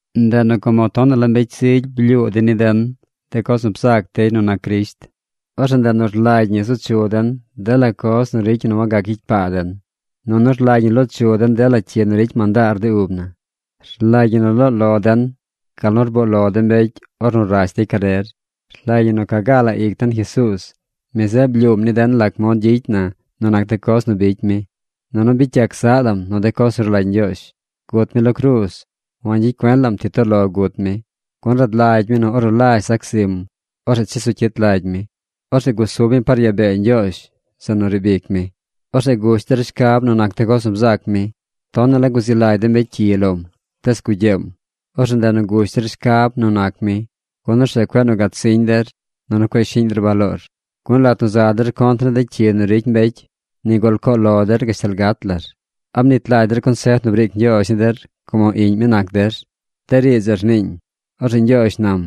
Ndeꞌ nu como tonaꞌ la mbecy zigy blyuu dey ni den de coz nu bzac dey nu nac Crisht, orzeꞌ ndeꞌ nu rlagy ñi zu chu den dela coz nu ricy ñi nu wagac gyicy paa den, nunu rlagy ñi loo chu den dela cyi nu ricy mandaar de ub na. Rlagy ñi nu loo lo den gal nu rboo lo de mbecy ornu rash dey carer. Rlagy ñi nu ca gaa la ic den Jesuuz. Mi zeꞌ blyuum ni den lac mod gyicy na nu nac de coz nu bicy mi. Nunu bicy yac zaꞌ lam nu de coz nu rlagy Ñgyoozh. Gut mi lo cruuz. Wangyicy cuen lam ti toꞌ lo gut mi, gun rad lagy mi nu ornu lazh zac zim, orzeꞌ chesu cyit lagy mi. Orzeꞌ gusub mi par yaa bee Ñgyoozh zeꞌ nu riib ic mi. Orzeꞌ gush der shcab nu nac de coz nu bzac mi. Tonaꞌ la guzi lagy de mbecy cyi lom, tees gugyeem. Orzeꞌ ndeꞌ nu gush der shcab nu nac mi, gun orzeꞌ cueꞌ nu gatsiñ der, nunu cueꞌ shiꞌñ der baloor. Gun lat nu za der contr ni de cyi nu ricy mbecy, nigul coo lo der gashtal gat lar. ¿A mnit lagy der consef nu briic Ñgyoozh ni der como iꞌñ mi nac der? De riidz zeꞌ rniiñ: Orzeꞌ Ñgyoozh nam: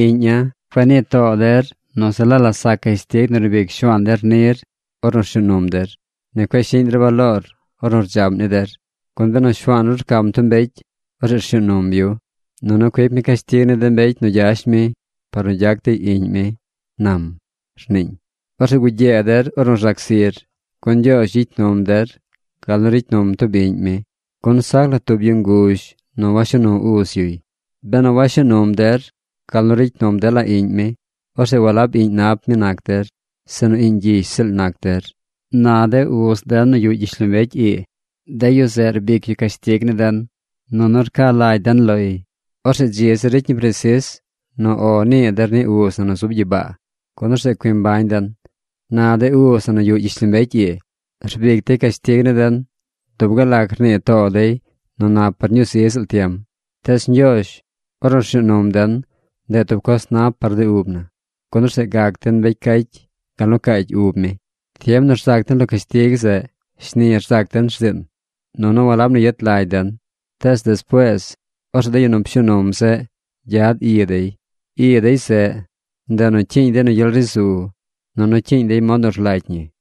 Iꞌña̱, cueꞌ nii too der nu se la la sac cashtig nu rbic Shuaan der nir ornu rshuu num der. Ni cueꞌ shiꞌñ der baloor ornu rdzaꞌm ni der. Gun benu Shuaan ru rcam tub mbecy, orzeꞌ rshuu num yu. Nunu cuic mi cashtig ni de mbecy nu gyash mi par nu gyac dey iꞌñ mi, nam, rniiñ. Orzeꞌ gugyee der ornu rzac zir, gun Ñgyoozh gyicy num der gal nu ricy num tub iꞌñ mi, gun sac la tub yu nguzh nu washuu nu uz yuy. Benu washuu num der gal nu ricy num dela iꞌñ mi, orzeꞌ walab iꞌñ nap mi nac der, sinu iꞌñ gyish ziꞌl nac der. Na de uz den nu yuꞌ gyishlombecy ii, de yu zeꞌ rbic yu cashtig ni den, nunu rca lagy den loy. Orzeꞌ dzi zir ricy ñi presis nu “O” nii der ni uz na nu zub gyibaa, gun orzeꞌ cui mbañ den. Na de uz na nu yuꞌ gyishlombecy ii, rbic dey cashtig ni den dub gal lac rnii too dey nu nap par ñuu zi ziꞌl tiem. Tees Ñgyoozh, ornu rshuu num den, ndeꞌ tub coz nap par de ub na, gun orzeꞌ gac den mbecy cacy gal nu caacy ub mi. Tiem nu rzac den lo cashtig zeꞌ, shni rzac den rziin, nunu walab nu yet lagy den. Tees despuees orzeꞌ de yu nu pshuu num zeꞌ gyad i dey. I dey zeꞌ, ndeꞌ nu cyiiñ dey nu gyel ri zu, nunu cyiiñ dey mod nu rlagy ñi.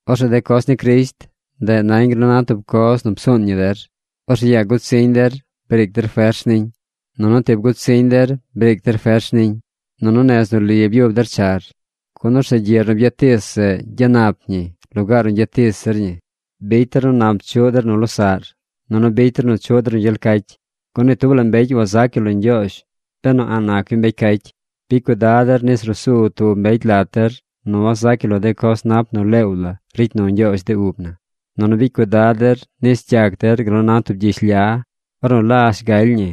Orzeꞌ de coz ni Crisht, ndeꞌ nañ gal nu na tub coz nu psuun ñi der. Orzeꞌ yaa gutsiñ der, briic der fers niñ. Nunu tib gut siñ der briic der fers niñ. Nunu nez nu li byub der char, gun orzeꞌ gyiꞌr nu byatis zeꞌ gyanap ñi lugaar nu gyatis zir ñi. Bicy der nu nap chuꞌ der nu losaꞌr, nunu bicy der nu chuꞌ der nu gyel cacy, gun ni tub la mbecy wazac yu lo Ñgyoozh benu a̱ꞌ nac yu mbecy cacy. Bicy cuidad der nis ruu su tub mbecy lat der nu wazac yu lo de coz nap nu leew la ricy nu Ñgyoozh de ub na. Nunu bicy cuidad der nis gyac der gal nu na tub gyish lya. Ornu lazh galy ñi,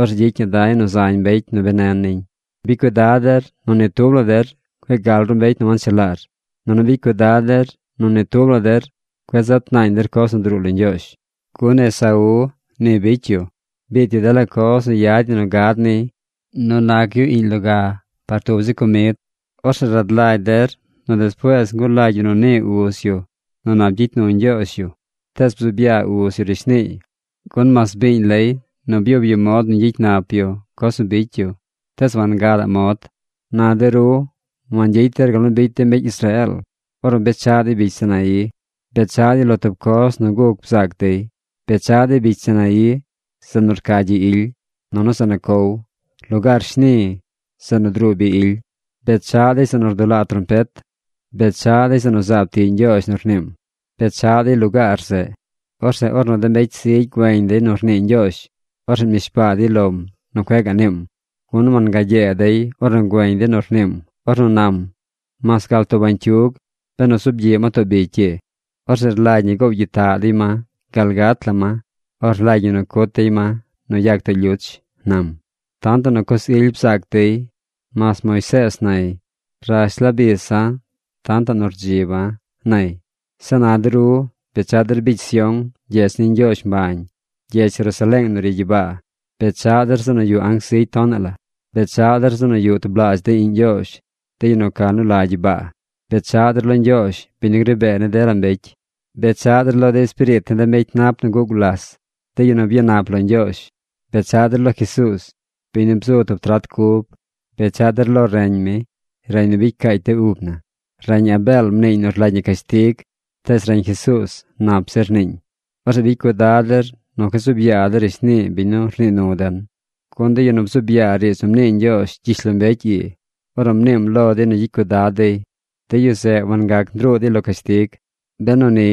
orzeꞌ gyicy ñi da̱y nu zañ mbecy nu benen niñ. Bicy cuidad der nu ni tub la der cueꞌ gal ru mbecy nu wanchelaar. Nunu bicy cuidad der nu ni tub la der cueꞌ zat naañ der coz nu druu lo Ñgyoozh. Gun Esaú ni bicy yu. Biit yu dela coz nu yad ñi nu gad niy nu nac yu iꞌñ loga par tub zi comid. Orzeꞌ rad lagy der nu despuees ngulagy yu nu nii uz yu nu nap gyicy nu Ñgyoozh yu, tees bzuub yaa uz yu rishniiy, gun mas biiñ lay nu byub yu mod nu ñgyicy nap yu coz nu bicy yu, tees wangadaꞌ mod. Na de ru wangyicy der gal nu bicy de mbecy Israeel ornu bechaꞌ dey bicy Sinaí. Bechaꞌ dey lo tub coz nu guc bzaac dey. Bechaꞌ dey bicy Sinaí, zeꞌ nu rca gyi ily, nunu zeꞌ nu cow, lugaar shni, zeꞌ nu druu bi ily. Bechaꞌ dey zeꞌ nu rdulaa trompet. Bechaꞌ dey zeꞌ nu zaab tiꞌ Ñgyoozh nu rniim. Bechaꞌ dey lugaar zeꞌ. Orzeꞌ ornu de mbecy zigy güeñ dey nu rnii Ñgyoozh, orzeꞌ mnishbaa dey lom nu cueꞌ gaꞌ niim. Gun wangagyee dey ornu güeñ dey nu rniim ornu nam: “Mas gal tub bañcyug, benu zuub gyiꞌ ma too bicy ii, orzeꞌ rlagy ñi goow gyitaꞌ dey ma gal gat la ma o rlagy ñi nu cut dey ma nu yag too lyuch”, nam. Tantaꞌ nu coz ily bzaac dey. Mas Moisees nay: “Rash la bisa̱ tantaꞌ nu rdziba̱”, nay. Zeꞌ na de ru bechaꞌ der bicy Sión, gyedz ni Ñgyoozh mbañ, gyedz Jerusaleeng nu ri gyibaa. Bechaꞌ der zeꞌ nu yuꞌ anc zigy tonaꞌ la. Bechaꞌ der zeꞌ nu yuꞌ tublaazh de iꞌñ Ñgyoozh, de yu nu ca nu la gyibaa. Bechaꞌ der lo Ñgyoozh, biñ nu gri bee ni dela mbecy. Bechaꞌ der lo de espiriit ni de mbecy nap nu guꞌ gulas, de yu nu byanap lo Ñgyoozh. Bechaꞌ der lo Jesuuz, biñ nu bzu tub trat cub. Bechaꞌ der lo reñ mi, reñ nu bicy caacy de ub na. Reñ Abeel mniiñ nu rlagy ñi cashtig, tees reñ Jesuuz nap zir rniiñ. Orzeꞌ bicy cuidad der nu cueꞌ zuub yaa der rishnii biñ nu rnii nu den. Gun de yu nu bzuub yaa riidz nu mnii Ñgyoozh gyishlombecy ii ornu mniim lo dey nu gyicy cuidad dey, de yu zeꞌ wangac ndruu dey lo cashtig. Benu ni,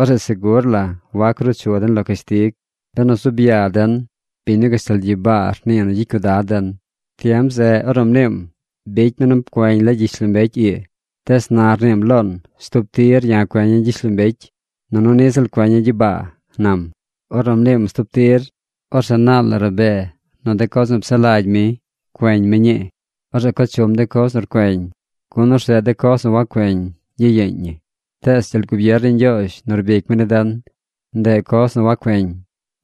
orzeꞌ segur la wac ruu chu den lo cashtig, benu zuub yaa den biñ nu gashtal gyibaa rnii nu gyicy cuidad den. Tiem zeꞌ ornu mniim, bicy mi nu pcueñ la gyishlombecy ii, tees na rniim loon: “Stub tir ya̱ cueña̱ gyishlombecy, nunu niꞌ ziꞌl cueña̱ gyibaa”, nam. Ornu mniim “Stub tir”, orzeꞌ naal la rabee nu de coz nu psaꞌ lagy mi, cueñ mi ñii. Orzeꞌ co chum de coz nu rcueñ, gun orzeꞌ de coz nu wacueñ, gyiyeeñ ñi. Tees gyel gubier ni Ñgyoozh nu rbic mi ni den, ndeꞌ coz nu wacueñ.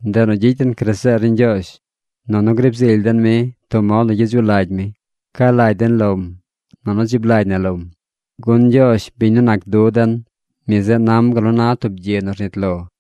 Ndeꞌ nu gyicy den graseer ni Ñgyoozh, nunu griib zily den mi tub mod nu gyedzuꞌ lagy mi. Ca lagy den lom, nunu dzib na lom. Gun Ñgyoozh, biñ nu nac du den, mi zeꞌ nam gal nu na tub gyi nu rnit lo.